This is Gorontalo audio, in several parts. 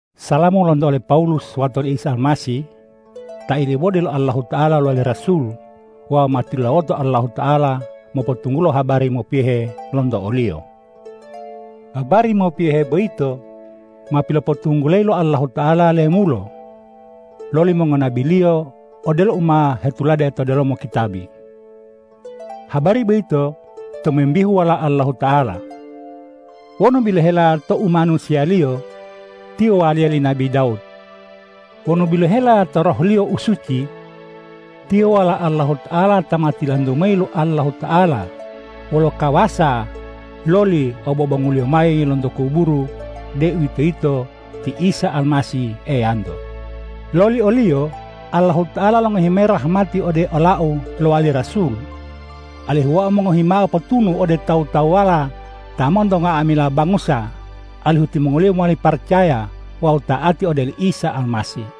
Salamu lonto ole Pawulus wato li Isa Almasih, ta ilibode lo Allahuta'ala lowali rasul wawu ma tilulawoto Allahuta'ala mopotunggulo habari mopiyohe lonto o-Liyo. Habari mopiyohe boyito ma pilopotunggulayi lo Allahuta'ala lemulo loli mongonabi-Liyo odelo u ma hetulade to delomo kitabi. Habari boyito tomimbihu Walao Allahuta'ala. Wonu bilohela to umanusiya-Liyo, Tiyo waliya li nabi Dawud. Wonu bilohela to Roh-Liyo u suci, Tiyo Walao Allahuta'ala ta ma tilantu mayi lo Allahuta'ala wolo kawasa loli lo obobongu-Liyo mayi lonto kuburu, deuwitoyito ti Isa Almasih Eyanto. Loli o-Liyo Allahuta'ala longohi mayi rahmati ode olau lowali rasul, alihu wau mongohi mao potunu ode tawu-tawuwala ta monto nga'amila bangusa, alihu timongoliyo mowali paracaya wawu ta'ati ode oli Isa Almasih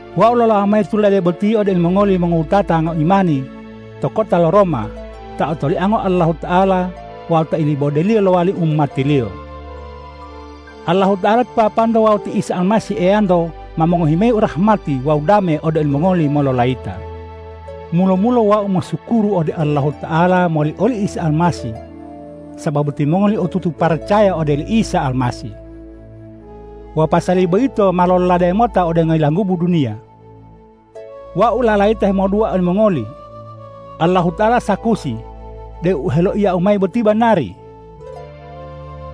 Wau lolawo mayi tulade boti ode olimongoli mongowutata ngoimani to kota lo Roma, ta otoliango Allahuta'ala wawu ta ilibode-Liyo lowali umati-Liyo. Allahuta'ala ti Papanto wawu ti Isa Almasih Eyanto ma mongohi mayi rahmati wawu dame ode olimongoli mololayita. Mulo-mulo wau mosukuru ode Allahuta'ala moli oli Isa Almasih sababu timongoli otutu paracaya ode oli Isa Almasih. Wawu pasali boyito ma lololade mota ode ngoyilanggubu duniya. Wau lalayita hemodua olimongoli. Allahuta'ala sakusi deu u heloiyau mayi boti banari.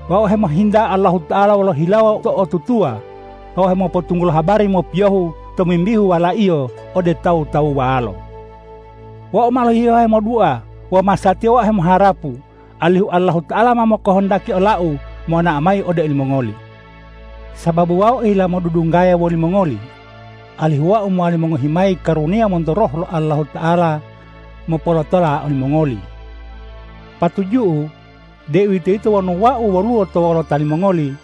Wau hemohinta Allahuta'ala wolo hilawo to'otutuwa wawu hemopotunggulo habari mopiyohu tomimbihu Wala-Iyo ode tawu-tawuwalo. Wau ma lohihewo hemodua wawu masatiya wau hemoharapu, alihu Allahuta'ala ma kohondaki olau monao mayi ode olimongoli. Sababu wau ohila modudunggaya wolimongoli, alihu wau mowali mongohi mayi karuniya monto Roh lo Allahuta'ala mopolotola olimongoli. Patuju'u, deuwitoyito wonu wau woluwo to wolota limongoli,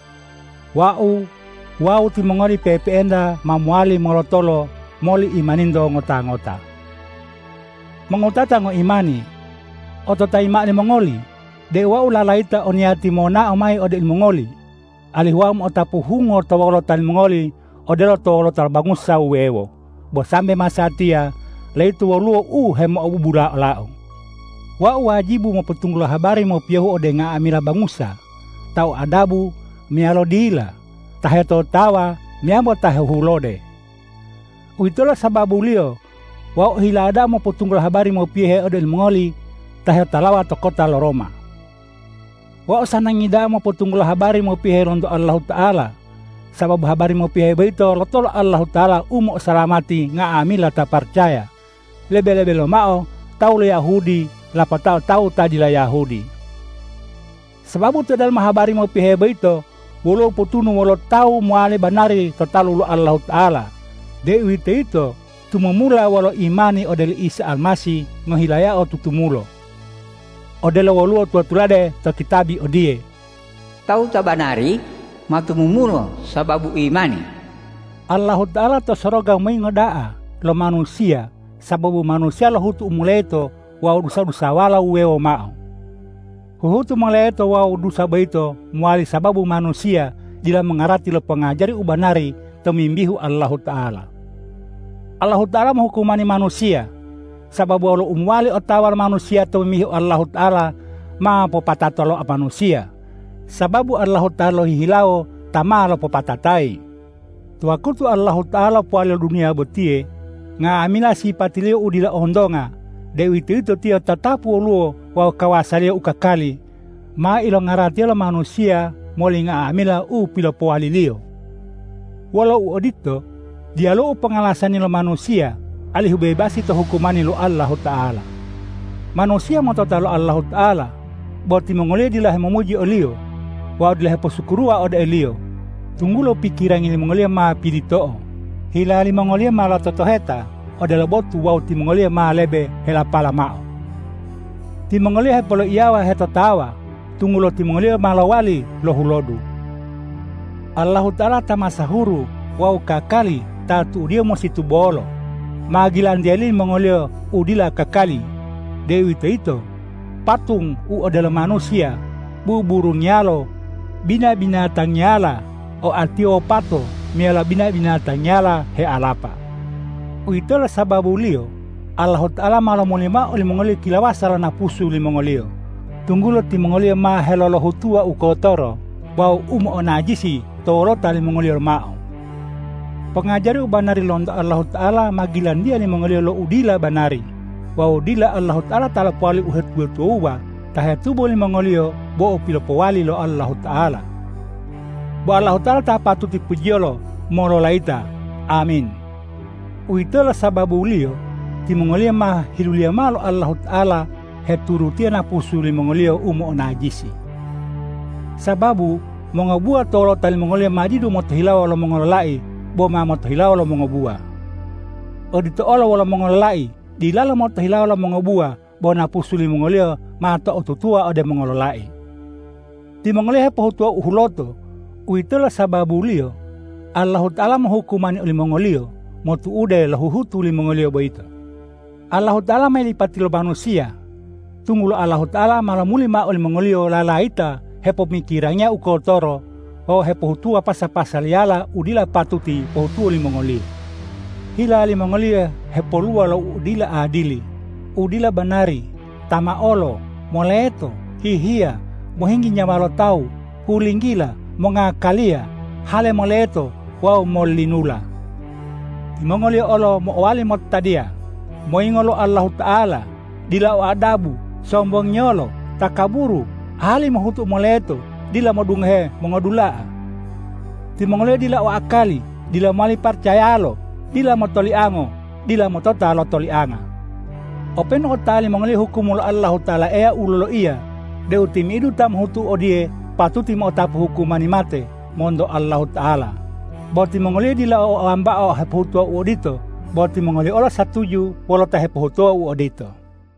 wau wawu timongoli pe'epe'enta ma mowali molotolo moli imaninto ngota-ngota. Mongowutata ngoimani, ototayi mao limongoli deu wau lalayita o niyati monao mayi ode olimongoli, alihu wau mo'otapu hungo to wolota limongoli odelo to wolota lo bangusa wuwewo, bo sambe masatiya layito woluwo u hemo'obubula olau. Wau wajibu mopotunggulo habari mopiyohu ode nga'amila bangusa, ta o adabu meyalo dila, ta hetotawa meyambo ta hehulode. Uwitolo sababuliyo wau ohila da'a mopotunggulo habari mopiyohu ode olimongoli ta hetolawa to kota lo Roma. Wau sanangi da'a mopotunggulo habari mopiyohe lonto Allahuta'ala, sababu habari mopiyohe boyito lotolo Allahuta'ala u mo'osalamati nga'amila ta paracaya, lebe-lebe lomao tawu lo Yahudi lapatao tawu ta dila Yahudi. Sababu to delomo habari mopiyohe boyito, woluwo potunu wololo tawu mowali banari to talu lo Allahuta'ala, deuwitoyito tumumula wolo imani ode oli Isa Almasih ngohilayao tutumulo, odelo woluwo tula-tulade to kitabi odiye,”Tawu ta banari ma tumumulo sababu imani.” Allahuta'ala to soroga moyingo da'a lo manusiya sababu manusiya lohutu u moleto wawu dusa-dusawala wuwewo mao. Huhutu moleto wawu dusa boyito mowali sababu manusiya dila mongarati lo pongajari u banari tomimbihu Allahuta'ala. Allahuta'ala mohukumani manusiya, sababu wolo u mowali otawa lo manusiya tomimbihu Allahuta'ala ma mopatato to manusiya, sababu Allahuta'ala lohihilawo ta ma lopopatatayi. To wakutu Allahuta'ala lopowali lo duniya botiye, nga'amila sipati-Liyo u dila ontonga, deuwitoyito Tiyo tatapu woluwo wawu kawasa-Liyo u kakali, ma ilongaratiya lo manusiya moli nga'amila u pilopowali-Liyo. Wolo uodito, diyaluwo u pongalasani lo manusiya alihu bebasi to hukumani lo Allahuta'ala. Manusiya motota lo Allahuta'ala, bo timongoliyo dila helomuji o-Liyo wawu dila heposukuruwa ode o-Liyo, tunggulo pikirangi limongoliyo ma pilito'o, hila limongoliyo ma lototoheta odelo botu wawu timongoliyo ma lebe helapalo mao. Timongoliyo hepoloiyawa hetotawa, tunggulo timongoliyo ma lowali lohulodu. Allahuta'ala ta masahuru wawu kakali ta tu'udiyo musi tubolo, ma gilantiya limongoliyo lo u dila kakali, deuwitoyito patung u odelo manusiya, buburungiyalo, bina-binatangiyala oatiyo wopato meyalo bina-binatangiyala healapa. Uwitolo sababuliyo Allahuta'ala ma lomuli mao olimongoliyo kilawasa lo napusu limongoliyo, tunggulo timongoliyo ma helolohutuwa u kotoro wawu u mo'onajisi to wolota limongoliyo lomao. Pongajari u banari lonto Allahuta'ala ma gilantiya limongoliyo lo u dila banari wawu dila Allahuta'ala ta lopowali lo uhetuwa-tuwawuwa ta hetubo limongoliyo bo u pilopowali lo Allahuta'ala. Bo Allahuta'ala ta patuti pujiyolo mololayita! Amin. Uwitolo sababuliyo timongoliyo ma hiluliya mao lo Allahuta'ala heturutiya napusu limongoliyo u mo'onajisi. Sababu mongobuwa to wolota limongoliyo ma didu motohilawo lo mongololai bo ma motohilawo lo mongobuwa. Odito olo wolo mongololai dilalo motohilawo lo mongobuwa bo napusu limongoliyo ma to'otutuwa ode mongololai. Timongoliyo hepohutuwa u huloto. Uwitolo sababuliyo Allahuta'ala mohukumani olimongoliyo motu'ude lo huhutu limongoliyo boyito. Allahuta'ala ma yilipatiyo lo manusiya, tunggulo Allahuta'ala ma lomuli mao olimongoliyo lalayita hepomokirangiya u kotoro wawu hepohutuwa pasa-pasaliyala u dila patuti pohutuwo limongoliyo. Hila limongoliyo hepoluwa lo u dila adili, u dila banari, tamaolo, moleto, hihiya, mohinggi nyawa lo tawu, hulinggila, mongakaliya, hale moleto wawu mollinula. Timongoliyo olo mo'owali motadiya, moyingo lo Allahuta'ala, dila o adabu, sombongiyolo, takaburu, ahali mohutu u moleto, dila modungohe mongodula'a. Timongoliyo dila o akali, dila mowali paracayalo, dila motoliango, dila motota lo tolianga. Openu otawa limongoliyo hukum lo Allahuta'ala Eya u loloiya deu timi'idu ta mohutu odiye patuti mo'otapu hukumani mate monto Allahuta'ala, bo timongoliyo dila bo wambao hepohutuwa u odito, bo timongoliyo olo satuju wolo ta hepohutuwa u odito.